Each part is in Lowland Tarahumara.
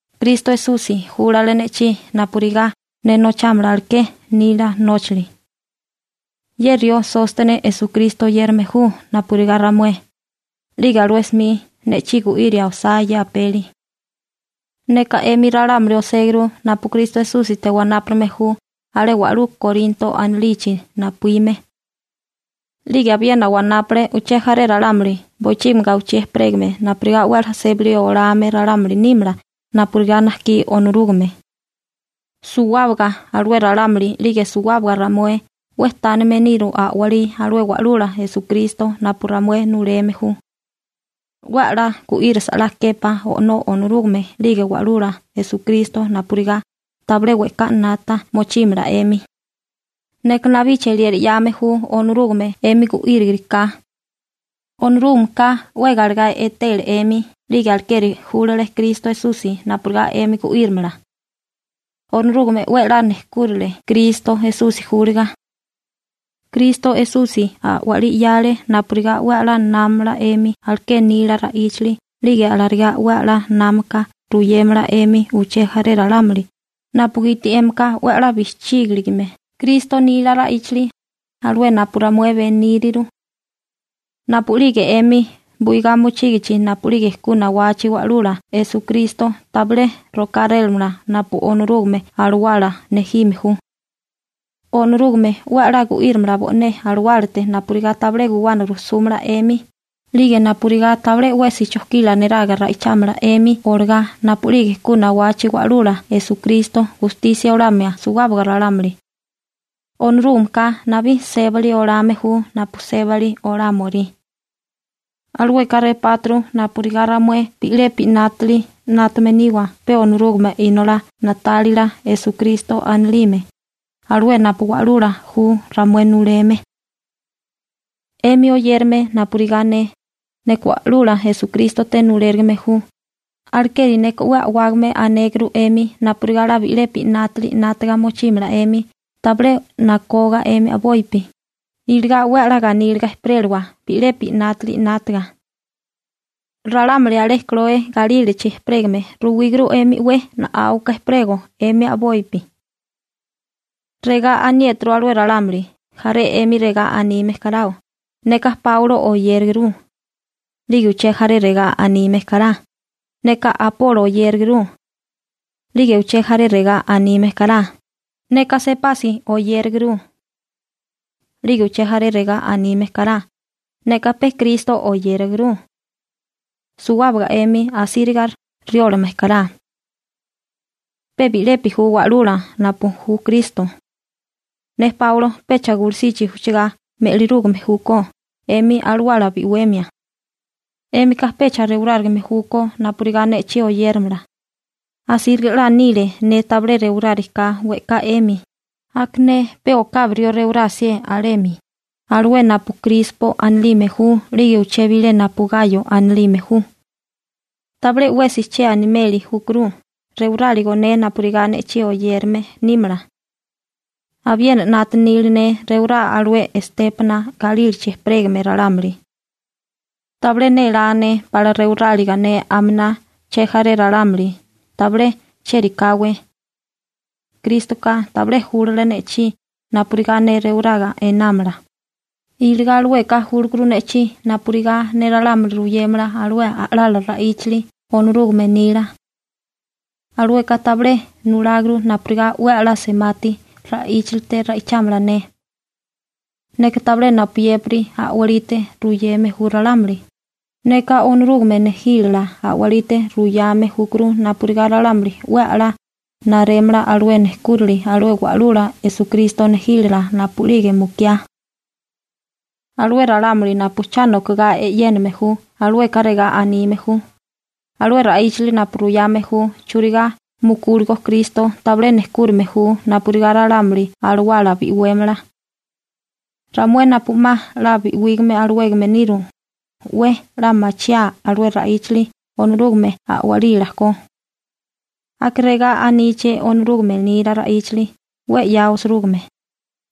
Kristo Esusi júlale ne'chí napurigá ne nochámala aleké nila nóchali. Ye rió Sóstene Esukristo oyérame ju napurigá ramué, 'lige alué 'smi ne'chí gu'iria osá ye apeli. Neka 'emi ralámuli oséguru napu Kristo Esúsite wanápurigame ju alé wa'lú Korinto anilichi napuíme. 'Lige abiena wanápule uché jaré ralámuli bochígimi gawichí ejperégame napurigá 'we 'la sébali olame ralámuli nímala napurigá najkí Onorúgame. Suwábaga alué ralámuli 'lige suwábaga ramué 'we tánime niru a'walí alué Wa'lula Esukristo napu ramué nuleme ju. 'We 'la gu'írasa 'la képá O'nó Onorúgame 'lige Wa'lula Esukristo napurigá tabilé we'ká 'nata mochímala 'emi. Neka nabí cheliera 'yame ju Onorúgame 'emi gu'írigiriká. Onorúgameka 'we galegá etele 'emi 'lige alekeri júlale Kristo Esusi napurigá 'emi gu'írimala. Onorúgame 'we 'la nejkúrile Kristo Esusi júliga. Kristo Esusi a'walí 'yale napurigá 'we 'la námamala 'emi aleké nila ra'íchali 'lige alarigá 'we 'la námaka ruyémala 'emi uché jaré ralámuli napugiti 'émika 'we 'la bijchígilime Kristo nila ra'íchali, alué napu ramué beníriru. Napu'lige 'emi buigá mochígichi napu'lige ku nawachi Wa'lula Esukristo tabilé rokárélamala napu Onorúgame Alawala nejime ju. Onorúgame 'we 'la gu'írimala bo'né alawálate napurigá tabilé guwana rujsúmala 'emi 'lige napurigá tabilé 'wesi chojkila neraga ra'ichámala 'emi olagá napu'lige ku nawachi Wa'lula Esukristo gustisia olamia suwábaga ralámuli. Onorúgameka nabí sébali olame ju napu sébali olámorí. Alueka repáturu napurigá ramué bi'lepi 'nátali 'nátame niwa pe Onorúgame Inolá na'tálila Esukristo anilime, alué napu wa'lula ju ramué nuleme. 'Emi oyérame napurigá ne, neka Wa'lula Esukrístote nulérigime ju, alekeri neka 'we a'wágame anéguru 'emi napurigá 'la bi'lepi 'nátali 'nátiga mochímala 'emi tabilé nakoga 'emi a'bopi, iligá 'we 'la ganíliga ejperélawa bi'lepi 'nátali 'nátaga. Ralámuli alé Kloe galílachi ejperégame ruwíguru 'emi 'we na'áuka ejperego 'emi a'bopi. Regá aniéturu alué ralámuli, jaré 'emi regá anime karao: «Neka Páulo oyéraguru», 'lige uché jaré regá anime kará: «Neka Apolo oyéraguru.» 'Lige uché jaré regá anime kará: «Neka Sepasi (Pegro) oyéraguru.» 'Lige uché jaré regá aníime kará: «Neka pe Kristo oyéraguru.» Suwábaga 'emi asíriga riólame kará. Pe bi'lepi ju Wa'lula, napu ju Kristo. Ne Páulo pecha gulusichi ujchigá me'lirúgame júkó 'emi alawala bi'wemia. 'Émika pecha rewarárigame júkó napurigá ne'chí oyéramala. Asíriga 'la nile ne tabilé rewarágariká we'ká 'emi, aka ne pe okabi rió rewirá 'sié alemi, alué napu Krispo anilime ju 'lige uché bilé napu Gayo anilime ju. Tabilé 'wesi che animeli júkuru rewaráligo ne napurigá ne'chí oyérame nímala. Abiena bijí nélá nili ne rewará alué Estépana galílachi ejperégame ralámuli. Tabilé machié nili ne pala rewiráliga ne aminá chejaré ralámuli, tabilé chérikáwé. Krístoka tabilé júlale ne'chí napurigá ne rewaraga einámala, iligá alueka júlakuru ne'chí napurigá ne ralámuli ruyémala alué a'lala ra'íchali Onorúgame nila. Alueka tabilé nuláguru napurigá 'we 'la semati ra'íchalite ra'ichámala ne. Neka tabilé napuyépiri a'walite ruyeme ju ralámuli, neka Onorúgame nejílala a'walite ruyame júkuru napurigá ralámuli 'we a'lá narémala alué nejkúrali alué Wa'lula Esukristo nejílala napu'lige mukiá. Alué ralámuli napu cha nokagá e'yéname ju, alueka regá anime ju: «Alué ra'íchali napu ruyame ju churigá mukúligo Kristo tabilé nejkúrime ju napurigá ralámuli alawala bi'wémala. Ramué napu 'ma 'la bi'wígame alawégame niru, 'we 'la machiáa alué ra'íchali Onorúgame a'walila ko.» Aka regá aníché Onorúgame nila ra'íchali 'we 'ya osirúgime: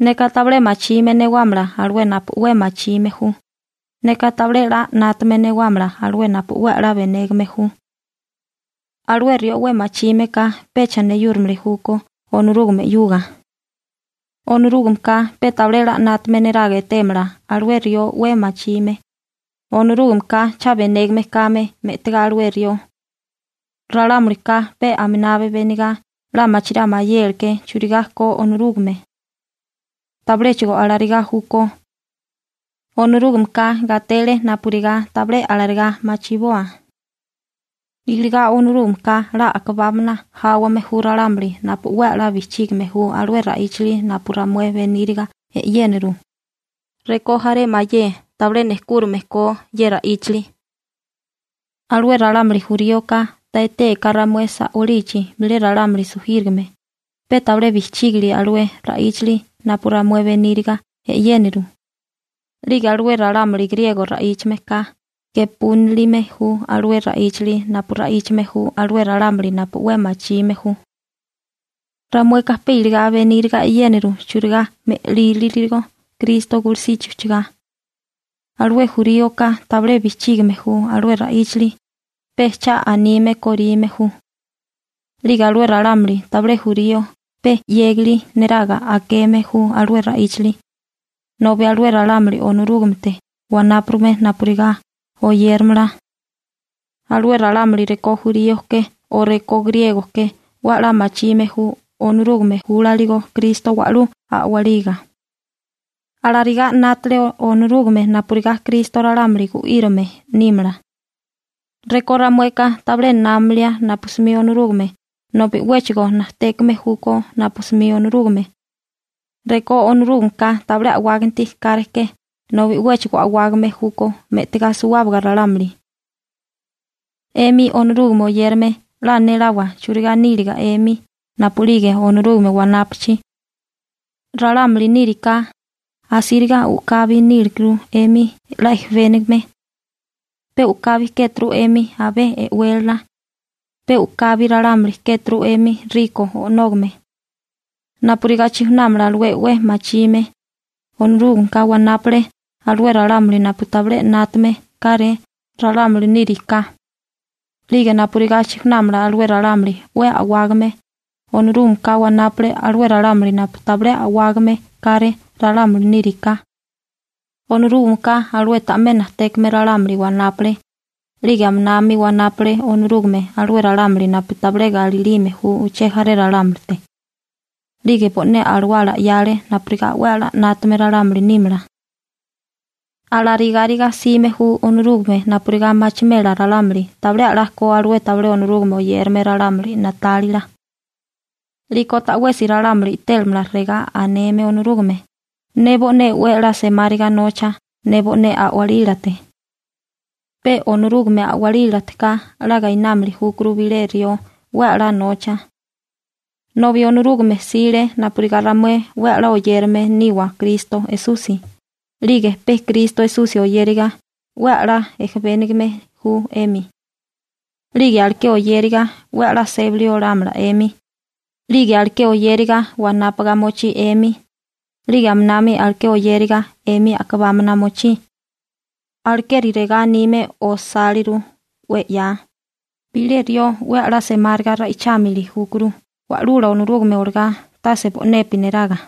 Neka tabilé machime newámala alué napu 'we machime ju. Neka tabilé 'la 'nátame newámala alué napu 'we 'la benégame ju. Alué rió 'we machime ka pecha neyúrimili júkó Onorúgame 'yuga. Onorúgameka pe tabilé 'la 'nátame neraga etémala alué rió 'we machime, Onorúgameka cha benégame kame me'tigá alué rió. Ralámulika pe aminabi benigá 'la machirá mayéleké churigá ko Onorúgame. Tabiléchigo alarigá júkó. Onorúgameka gatele napurigá tabilé alarigá machiboa. Iligá Onorúgameka 'la a'kabámana jáwame ju ralámuli napu 'we 'la bijchígime ju alué ra'íchali napu ramué beníriga e'yéniru, rekó jaré mayé tabilé nejkúrime ko ye ra'íchali. Alué ralámuli juríoka ta etéaká ramué sa'wálichi bilé ralámuli sujírigame, pe tabilé bijchíginili alué ra'íchali napu ramué beníriga e'yéniriru. 'Lige alué ralámuli griego ra'íchame ka gepúnilime ju alué ra'íchali napu ra'íchame ju alué ralámuli napu 'we machime ju. Ramueka pe iligá beníriga e'yéniru churigá me'líriligo Kristo gulusichi ujchugá. Alué juríoka tabilé bijchígime ju alué ra'íchali, pe cha anime korime ju. 'Lige alué ralámuli tabilé jurío pe 'yégali neraga akeme ju alué ra'íchali. Nobi alué ralámuli Onorúgamete wanápurigame napurigá oyéramala, alué ralámuli rekó jurío ke o rekó griego ke 'we 'la machime ju Onorúgame júlaligo Kristo wa'lú a'waliga. Alarigá 'nátale Onorúgame napurigá Kristo ralámuli gu'írame nímala. Rekó ramueka tabilé námalia napu 'smi Onorúgame, nobi 'wéchigo najtékame júkó napu 'smi Onorúgame. Rekó Onorúgameka tabilé a'wáganti káreké nobi 'wéchigo a'wágame júkó me'tigá suwábaga ralámuli. 'Emi Onorúgame oyérame 'la néláwa churigá níliga 'emi napu'lige Onorúgame wanápachi. Ralámuli níriká, asíriga u'kabi nílikuru 'emi 'la ejebénigame. Pe u'kabi kéturu 'emi abé e'wélala. Pe u'kabi ralámuli kéturu 'emi riko o'nógame. Napurigá chijunámala alué 'we machime, Onorúgameka wanápale alué ralámuli napu tabilé 'nátame káré ralámuli níriká. 'Lige napurigá chijunámala alué ralámuli 'we a'wágame, Onorúgameka wanápale alué ralámuli napu tabilé a'wágame káré ralámuli níriká. Onorúgameka alué ta'mé najtékame ralámuli wanápale, 'lige aminami wanápale Onorúgame alué ralámuli napu tabilé galilime ju uché jaré ralámulite. 'Lige bo'né Alawala 'yale napurigá 'we a'lá 'nátame ralámuli nímala. Alarigáriga 'sime ju Onorúgame napurigá machimela ralámuli tabilé a'lá ko alué tabilé Onorúgame oyérame ralámuli na'tálila. 'Liko ta'wesi ralámuli i'télamala regá aneme Onorúgame: «Ne bo'né 'we a'lá semáriga nocha ne bo'né a'walílate.» Pe Onorúgame a'walílateká 'la gainámili júkuru bilé rió 'we a'lá nocha. Nobi Onorúgame 'sile napurigá ramué 'we 'la oyérame niwa Kristo Esusi 'lige pe Kristo Esusi oyériga 'we 'la ejebénigame ju 'emi. 'Lige aleké oyériga 'we 'la sébali olámala 'emi. 'Lige aleké oyériga wanápaga mochí 'emi. 'Lige aminami aleké oyériga 'emi a'kabámana mochí. Alekeri regá anime osáliru 'we 'ya: «Bilé rió 'we a'lá semáriga ra'ichámili júkuru Wa'lula Onorúgame olagá, tase bo'nepi neraga.»